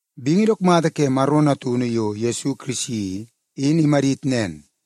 Bingi dook mata ke Maro Natunu yo Yesu Kirisi i, in imadit nen.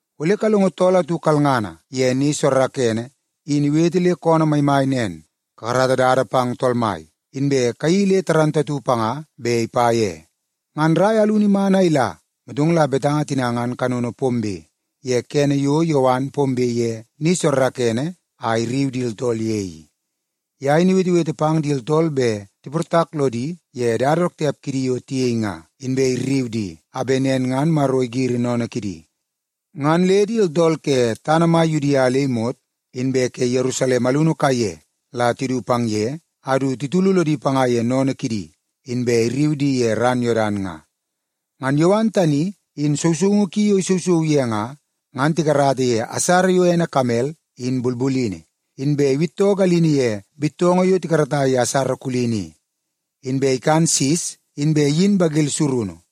Ole kalongo tool atu kalngana ye ni soorookoonoo, in iwete le koonoo maimai nen, ‘Kakarata dada pang Tool Mai, inbe kayeii le dundunngana panga bet ipa ye.’” Ngan rai alunu iman a ila, motong la betanga tina ngan kanono pombe ye kene yo Yowan pombe ye ni soorookoonoo a irriu di tooltool ye i. Ye in iwetewete pang di tooltool bet tiportak lodi ye dada dook tiap kidi yo tiyei nga, inbe irriu di a bet nen ngan Maro igiri sennene kidi. Ngan le di tooltool ke tana mai Yudia le imot, inbe ke Yerusalem alunu kaiye la tidu pang ye, a du titulu lodi panga ye sennene kidi, inbe irriu di ye ran Yodan nga. Ngan Yowan tani in sousoungu ki yo isousou ye nga, ngan tikarata ye asara yo ene kamel in bulbulini, inbe iwittoo galini ye bittoongoo yo tikarata ye asara kulini i. Inbe ikan sis, inbe iyin bagil surunu.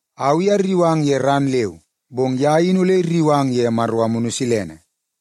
Au i arriu ang ye ran leu, bong ye in ole irriu ang ye Maro Amunu Silene.”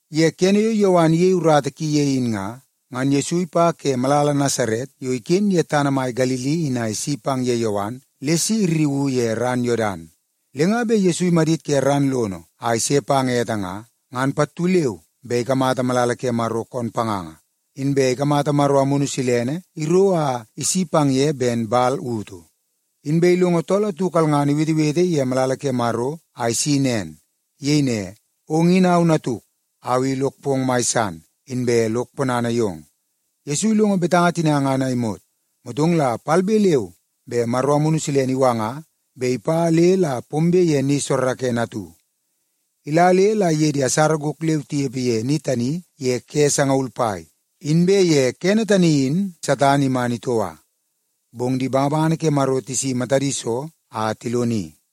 Ye kene yo Yowan iyei urata ki ye in nga, ngan Yesu ipa ke malala Nasaret yo iken ye tana mai Galili in a isi pang ye Yowan le si irriuu ye ran Yodan. Le nga bet Yesu imadit ke ran lono a ise pang ete nga, ngan pattu leu be ikamata malala ke Maro koon panganga, inbe ikamata Maro Amunu Silene iro a isi pang ye ben man utu. Inbe tool atu kalngana iwetewete ye malala ke Maro a isi nen. Iyei ne, “Ong in au Natuk. Au i lok pong mai san, inbe lok ponana yong.” Yesu ilongo betanga tina a imot, motong la palbe leu be Maro Amunu Silene iwanga bet ipa le la pombe ye ni soorookoonoo atu. Ila le la iye di asara gok leu tinepe ye ni tani ye ke sangaul pai, inbe ye kene tani in Satan iman itoua. Bong di bangabangana ke Maro tisi matadi so a tiloni.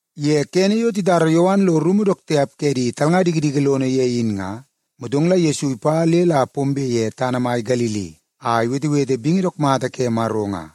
Ye kene yo titara Yowan lo rumu dook tiap ke di talnga dikidiki lono ye in nga, motong la Yesu ipa le la pombe ye tana mai Galili a iwetewete bingi dook mata ke Maro nga.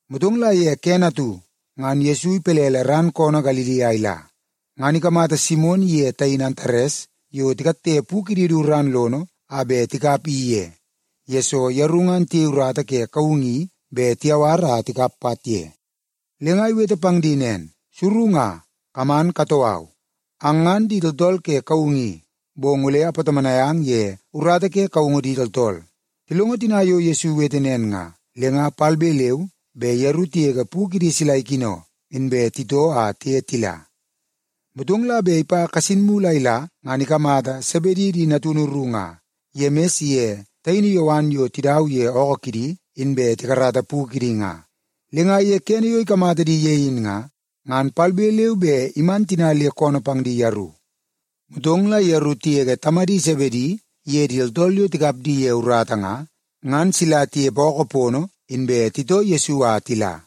Motong la ye kene atu, ngan Yesu ipelele ran koonoo Galili a ila, ngan ikamata Simon iye taini Antares yo tikatte pu kidi du ran lono a bet tikap i ye, yesoo yeru ngan tiyei urata ye kaungu i bet tiyawar a tikap pat ye. Le nga iwete pang di nen, “Suru nga, kaman katoo au. Ang ngan di tooltool ke kaungu i, bong ole apatomonai ang ye urata ke kaungu di tooltool.” Tilongo tina yo Yesu iwete nen nga, le nga palbe leu be yeru tigege pu kidi sila ikino, inbe titoo a tiye tila. Motong la bet ipa kasin mulu a ila, ngan ikamata Sebedi di natunu ru nga, Yemis iye taini Yowan yo tidau ye ookoo kidi inbe tikarata pu kidi nga. Le nga ye kene yo ikamata di ye in nga, ngan palbe leu be iman tina le koonoo pang di yeru. Motong la yeru tigege tamadi Sebedi iye di tooltool yo tikap di ye urata nga, ngan sila tinepe ookoo pono, inbe titoo Yesu a tila.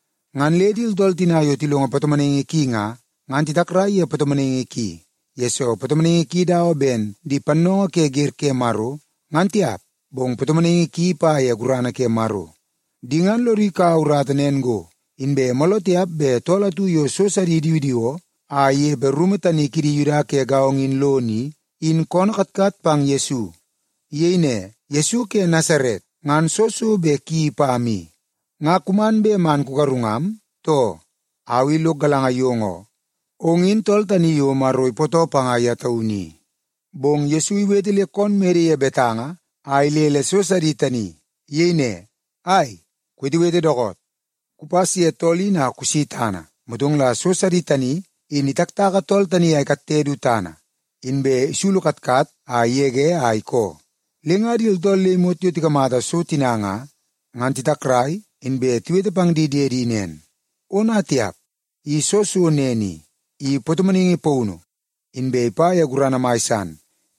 Ngan le di tooltool tina yo tilongo patomonaingi ki nga, ngan titakrai ye patomonaingi ki, yesoo patomonaingi ki dawa ben di pannoongoo ke wer ke Maro, ngan tiap, bong patomonaingi ki ipa ye gurana ke Maro. Di ngan lodi kaua urata nen go, inbe mooloo tiap bet tool atu yo so sidi idiwidiwoo a inepe rumu tani kidi Yuda ke gaongo in lono i, in koonoo katkat pang Yesu. Iyei ne, “Yesu ke Nasaret, ngan soo so bet kuyeii pam i? Nga kuman bet man kugarungam, too? Au i lok galanga yong oo, ong in tool tani yo Maro ipootoo panga ye taunu i.” Bong Yesu iwete le koon mede ye betanga a ilele so sidi tani. Iyei ne, “Ai, kuwetewete dookoot! Kupas ye tool in a kusi tana!” Motong la so sidi tani in itaktaka tool tani a ikatte du tana, inbe isulu katkat a igege a ikoo. Le nga di tooltool le imot yo tikamata so tina nga, ngan titakrai, inbe tiwete pang di diedi nen, “Ona tiap! I soo so nen i? I patomonaingi paunu, inbe ipa ye gurana mai san,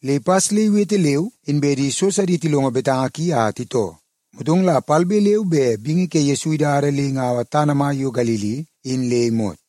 le ipas le iwete leu inbe di so sidi tilongo betanga ki a titoo.” Motong la palbe leu be bingi ke Yesu idada le ingaua tana mai yo Galili in le imot.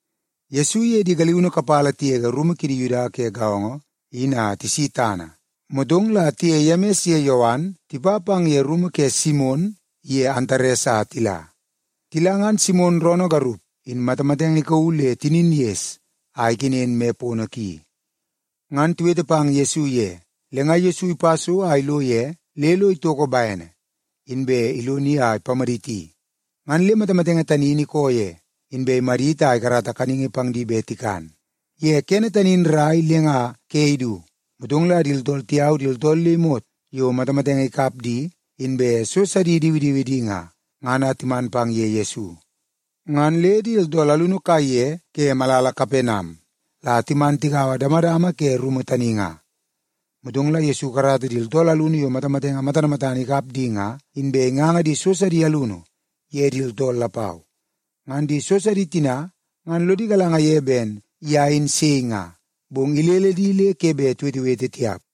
Yesu iye di galiunu kapala tigege rumu kidi Yuda ke gaongo in a tisi tana, motong la tiye Yemis ye Yowan tipa pang ye rumu ke Simon iye Antares a tila. Tila, ngan Simon roonoo garup in matamatenge ikauu le tinin ges a ikenen moi pono ki. Ngan tiwete pang Yesu ye. Le nga Yesu ipa so a ilo ye le lo itoko bene, inbe iloni a ipamaditi. Ngan le matamatenge tani in ikoo ye, inbe imadit a ikarata kaningi pang di bet tikan. Ye kene tani in rrai le nga ke idu, motong la di tooltool tiyau di tooltool le imot yo matamatenge ikap di, inbe so sidi idiwidiwi di nga, ngan a timan pang ye Yesu. Ngan le di tooltool alunu kaiye ke malala Kapenam la timan tigaua damadama ke rumu tani nga. Motong la Yesu ikarata di tooltool alunu yo matamatenge matana matana ikap di nga, inbe inganga di so sidi alunu ye di tooltool lapau. Ngan di so sidi tina ngan lodi galanga ye ben ye in sei nga, bong ilele di le ke bet tiwetewete tiap.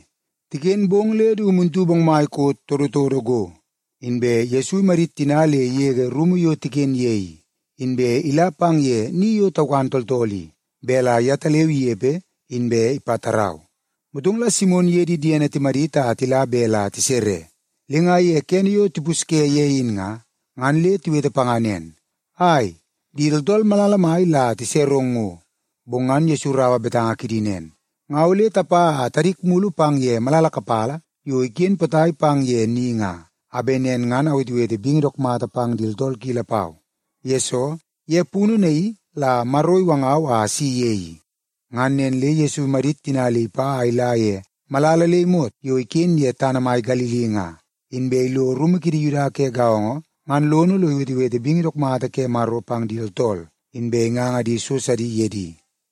Tiken bong le du muntu bongmai koot todotodo go, inbe Yesu imadit tina le igege rumu yo tiken ye i, inbe ila pang ye ni yo taukan tooltool i, bet la yetaleu inepe inbe ipatarau. Motong la Simon iye di diene timadit a tila bet la tisere, le nga ye kene yo tipusye ye in nga, ngan le tiwete panga nen, “Ai, di tooltool malala mai la tiserong ngo.” Bong ngan Yesu iraua betanga kidi nen, “Nga ole tapa a tadik mulu pang ye malala kapala yo iken potai pang ye ni nga, a bet nen ngan awetewete bingi dook mata pang di tooltool ki lapau. Yesoo, ye punu naii la Maro iwangau a asi ye i.” Ngan nen le Yesu imadit tina le ipa a ila ye malala le imot yo iken ye tana mai Galili nga, inbe ilo rumu kidi Yuda ke gaongo ngan lono lo iwetewete bingi dook mata ke Maro pang di tooltool, inbe inganga di so sidi ye di.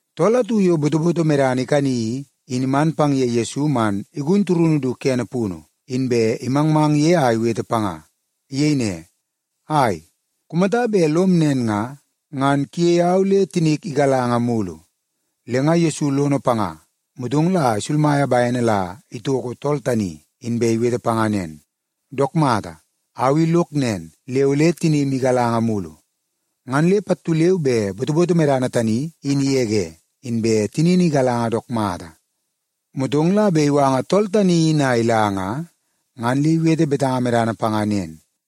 Tool atu yo botoboto medana ikani i, in iman pang ye Yesu man igun turunu du kene punu, inbe imangmang ye a iwete panga. Iyei ne, “Ai, kumata bet lom nen nga, ngan kuyei au le tinik igalanga mulu.” Le nga Yesu lono panga, motong la isulmaia bene la itoko tool tani, inbe iwete panga nen, “Dook mata, au i lok nen, le ole tinim igalanga mulu.” Ngan le pattu leu be botoboto medana tani in igege, inbe tinini igalanga dook mata. Motong la bet iwanga tool tani in a ila nga, ngan le iwete betanga medana panga nen,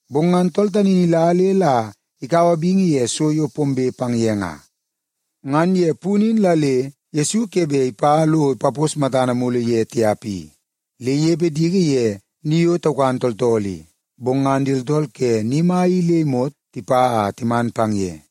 Bong ngan tool tani in ila le la ikaua bingi ye so yo pombe pang ye nga. Ngan ye punu in la le Yesu ke bet ipa lo ipapos matana mulu ye tiap i, le inepe diki ye ni yo taukan tooltool i. Bong ngan di tooltool ke ni mai i le imot tipa a timan pang ye.